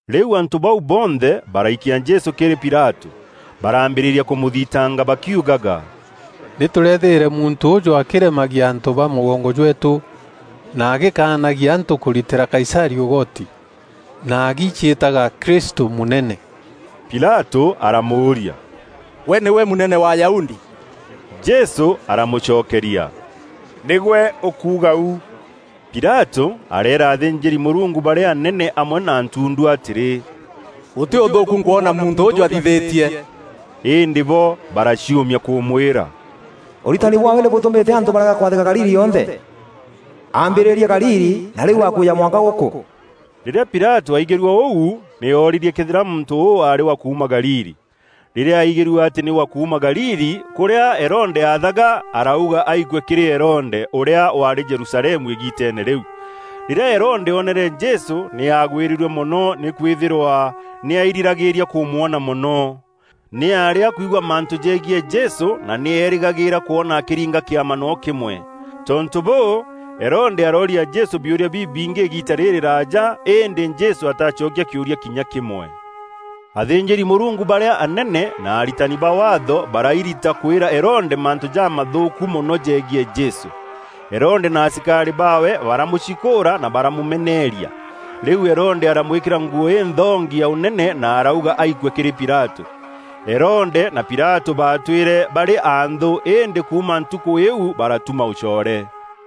Rîu antû bau bonthe baraikia Jesû kîrî Pilatû. Baraambîrîria kûmûthitanga bakiugaga, “Nî tûrethîre muntû ûûjû akîremagia antû ba mûgongo jweetû, na agîkanagia antû kûritîra Kaisarî ûgoti, na agiciîtaga Kristû, mûnene.” Pilatû aramûûria, “Gwe nîgwe mûnene wa Ayahudi?” Jesû aramûcokeria, “Nîgwe ûkuuga u.” Pilatû areera athînjîri-Mûrungu barîa anene amwe na ntundu atîrî, “Gûtî ûthûûku nkwona muntû ûûjû athithîtie.” Îndî bo baraciûmia kûmwîra, “Ûritani bwaawe nî bûtûmîte antû barega kwathîka Galili yonthe. Aambîrîrie Galili na rîu akwîja mwanka gûkû.” Rîrîa Pilatû aigîrue ûu, nî oorîrie këethîra muntû ûû aarî wa kuuma Galili. Rîrîa aigîrue atî nî wa kuuma Galili, kûrîa Herode aathaga, arauga aikue kîrî Herode, ûrîa waarî Jerusalemu îgiiteene rîu. Rîrîa Herode oonere Jesû, nî aagwîrîrue mono nîkwîthîrwa nî airîragîria kûmwona mono. Nî aarî akwigua mantû jegiî Jesû na nî eerîgagîîra kwona akîringa kîama noo kîmwe. Tontû bûû, Herode arooria Jesû biûria bibingî îgiita rîrîraaja, îndî Jesû ataacokia kîûria kinya kîmwe. Athînjîri-Mûrungu barîa anene na aritani ba Waatho barairita kwîra Herode mantû jamathûûku mono jegiî Jesû. Herode na asikarî baawe baramûcikûûra na baramûmeneeria. Rîu Herode aramwîkîra nguû înthongi ya ûnene na arauga aikue kîrî Pilatû. Herode na Pilatû baatwîre barî anthû îndî kuuma ntukû îîu baratuma ûcoore.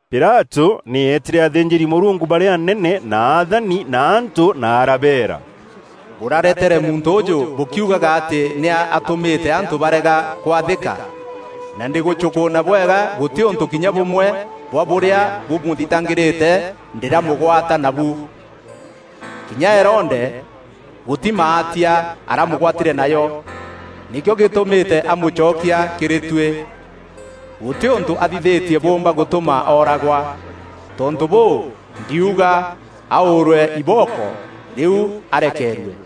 Pilatû nî eetîre athînjîri-Mûrungu barîa anene na athani na antû na arabeera, “Bûraretere muntû ûûjû bûkiugaga atî nî atûmîte antû barega kwathîka, na ndîgûcûnkûûna bwega gûtî ûntû kinya bûmwe bwa bûrîa bûramûthitangîrîte ndîramûgwata nabu. Kinya Herode, gûtî maatia aramûgwatîre najo, nîkîo gîtumîte amûcokia kîrî tuî. Gûtî ûntû athithîtie bûûmba gûtûma ooragwa. Tontû bûû, ndiuga aûûrwe ibooko rîu arekeerue.” [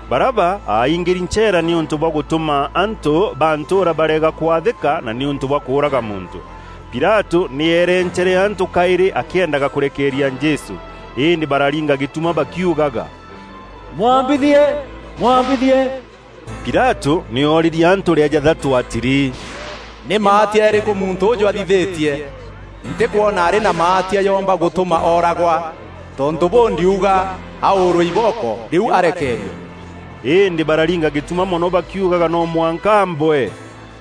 Baraba aingîri ncheera nîûntû bwa gûtûma antû ba ntûûra barega kwathîka na nîûntû bwa kûûraga muntû. Pilatû nî eerencere antû kaîrî akîendaga kûrekeeria Jesû. Îndî bararinga gîtuma bakiugaga, “Mwambithie! Mwambithie!” Pilatû nî oorîrie antû rîa jathatû atîrî, “Nî maatia jarîkû muntû ûûjû athithîtie? Ntîkwona arî na maatia joomba gûtûma ooragwa. Tontû bûû, ndiuga aûûrwe ibooko rîu arekeerue.” Îndî bararinga gîtuma mono bakiugaga no mwanka aambwe.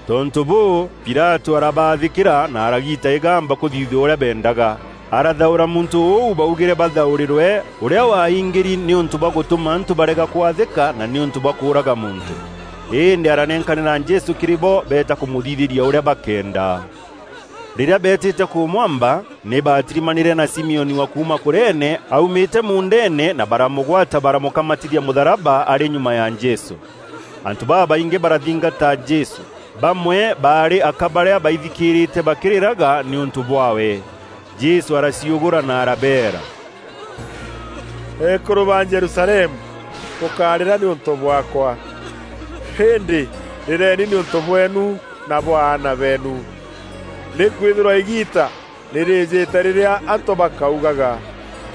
Tontû bûû, Pilatû arabaathîkîra na aragiita îgamba kûthithue ûrîa beendaga. Arathaûra muntû ûu baugîre bathaûrîrwe, ûrîa waingîri nîûntû bwa gûtûma antû barega kwathîka na nîûntû bwa kûûraga muntû. Îndî aranenkanîra Jesû kîrî bo beeta kûmûthithîria ûrîa bakenda. Rîrîa beetîte kûmwamba, nî baatirimanîre na Simioni wa kuuma Kurene aumîte muundeene na baramûgwata baramûkamatithia mûtharaba arî nyuma ya Jesû. Antû babaingî barathingata Jesû. Bamwe baarî aka barîa baithikîrîte bakîrîraga nîûntû bwaawe. Jesû araciûgûra na arabeera, “Eekûrû ba Jerusalemu, bûkárîra nîûntû bwaakwa, îndî rîreeni nîûntû bweenu na bwa aana beenu. Nîkwîthîrwa îgiita nî rîîjîte rîrîa antû bakaugaga,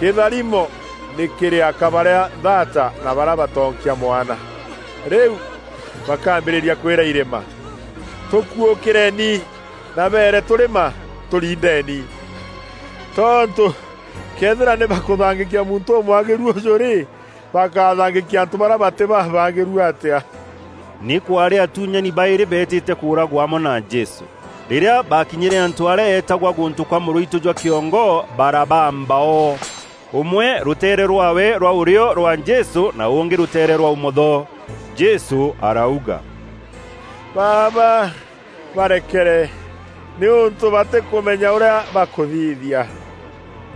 ‘Kîtharimo nî kîrî aka barîa nthata na barîa batoonkia mwana!’ Rîu bakaambîria kwîra irîma, ‘Tûkuûkîreeni,’ na beere tûrîma, ‘Tûriindeni.’ Tontû këethîra nî bakûthangîkia muntû ûmwagîru ûjû rî, bakathangîkia antû barîa batî babaagîru atîa?” Nî kwaarî atuunyani baîrî beetîte kûûragwa amwe na Jesû. Rîrîa baakinyîre antû arîa eetagwa Gûntû kwa mûrûitû jwa kîongo, barabaamba o. Ûmwe rûteere rwaawe rwa ûrîo rwa Jesû na ûngî rûteere rwa ûmotho. Jesû arauga, “Baaba, barekere, nîûntû batîkûmenya ûrîa bakûthithia.”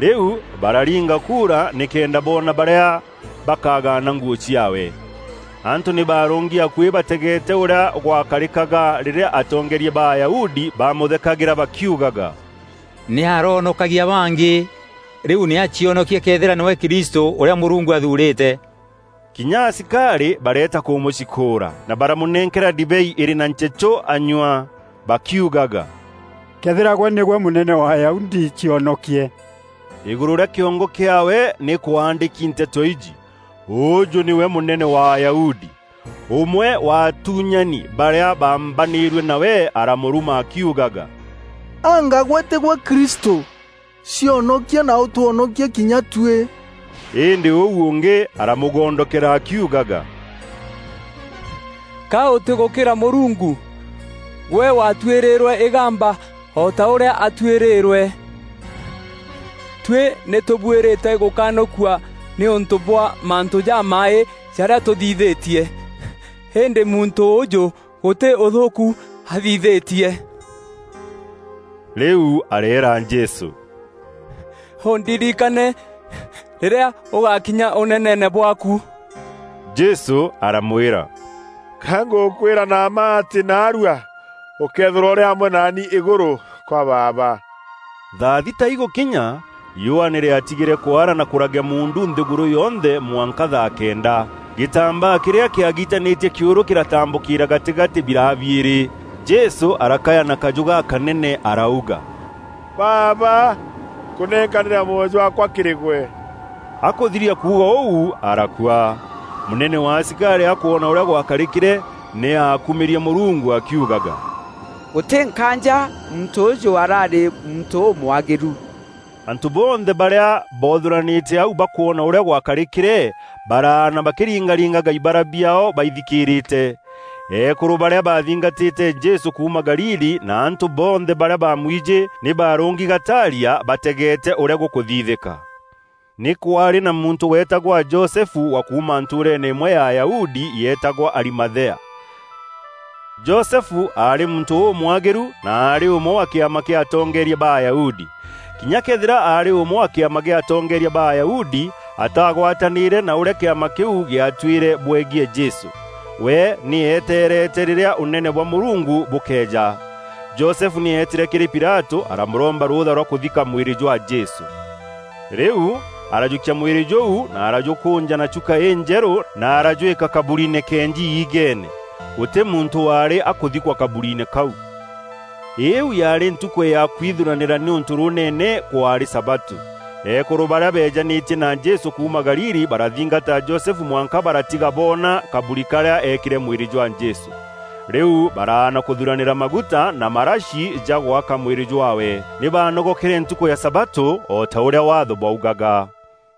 Rîu bararinga kuura nîkenda boona barîa bakagaana nguû ciaawe. Antû nî baarûngi akuî bategeete ûrîa gwakarîkaga rîrîa atongeeria ba Ayahudi bamûthekagîra bakiugaga, “Nî aroonokagia bangî, rîu nî acionokie këethîra nîwe Kristû, ûrîa Mûrungu athuurîte.” Kinya asikarî bareeta kûmûcikûûra, na baramûnenkera ndibei îrî na nchechû anyua, bakiugaga, “Këethîra gwe nîgwe mûnene wa Ayahudi, cionokie.” Îgûrû rîa kîongo kîaawe nî kwaandîki nteto iji: ÛÛJÛ NÎWE MÛNENE WA AYAHUDI. Ûmwe wa atuunyani barîa baambanîrue nawe aramûruma akiugaga, “Anga gwe tîgwe Kristû? Cionokie na ûtwonokie kinya tuî!” Îndî ûu ûngî aramûgondokera akiugaga, “Ka ûtîgûkîra Mûrungu? Gwe waatuîrîrwe îgamba o ta ûrîa aatuîrîrwe. Tuî nî tûbuîrîte gûkanûkua nîûntû bwa mantû jamaaî jarîa tûthithîtie. Îndî muntû ûûjû gûtî ûthûûku athithîtie.” Rîu areera Jesû, “Ûndirikane, rîrîa ûgakinya ûneneene bwaaku.” Jesû aramwîra, “Ka ngûkwîra na mma atî naarua ûkeethîrwa ûrî amwe naani îgûrû kwa Baaba.” Thaa thita igûkinya, riûa nî rîatigîre kwara na kûragea muundu nthîgûrû yonthe mwanka thaa kenda. Gîtambaa kîrîa kîagitanîtie kîûrû kîratambûkîra gatîgatî biraa biîrî. Jesû arakaya na kajû gakanene arauga, “Baaba, nkûnenkanîra mwoyo jwaakwa kîrî gwe!” Akûthiria kuuga ûu, arakua. Mûnene wa asikarî akwona ûrîa gwakarîkîre, nî aakumîrie Mûrungu akiugaga, “Gûtî nkaanja muntû ûûjû araarî muntû ûmwagîru!” Antû bonthe barîa boothûranîte au bakwona ûrîa gwakarîkîre, baraana bakîringaringaga ibara biaao baithikîrîte. Eekûrû barîa baathingatîte Jesû kuuma Galili na antû bonthe barîa baamwijî, nî baarûngi gataaria bategeete ûrîa gûkûthithîka. Nî kwaarî na muntû weetagwa Josefu wa kuuma ntûûreene îmwe ya Ayahudi yeetagwa Arimathea. Josefu aarî muntû ûmwagîru na aarî ûmwe wa kîama kîa atongeeria ba Ayahudi. Kinya këethîra aarî ûmwe wa kîama kîa atongeeria ba Ayahudi, ataagwatanîîre na ûrîa kîama kîu gîatuîre bwegiî Jesû. We nî eeteerete rîrîa Ûnene bwa Mûrungu bûkeeja. Josefu nî eetîre kîrî Pilatû aramûromba rûûtha rwa kûthika mwîrî jwa Jesû. Rîu arajûkia mwîrî jûu na arajûkûnja na chuka înjerû, na arajwîka kaburiine keenji iigeene. Gûtî muntû waarî akûthikwa kaburiine kau. Îîu yaarî ntukû ya kwithuranîra nîûntû rûûnene kwaarî sabatû. Eekûrû barîa beejanîtie na Jesû kuuma Galili barathingata Josefu mwanka baratiga boona kaburi karîa eekîre mwîrî jwa Jesû. Rîu baraana kûthuranîra maguta na marashi ja gwaka mwîrî jwaawe. Nî baanogokere ntukû ya sabatû o ta ûrîa Waatho bwaugaga.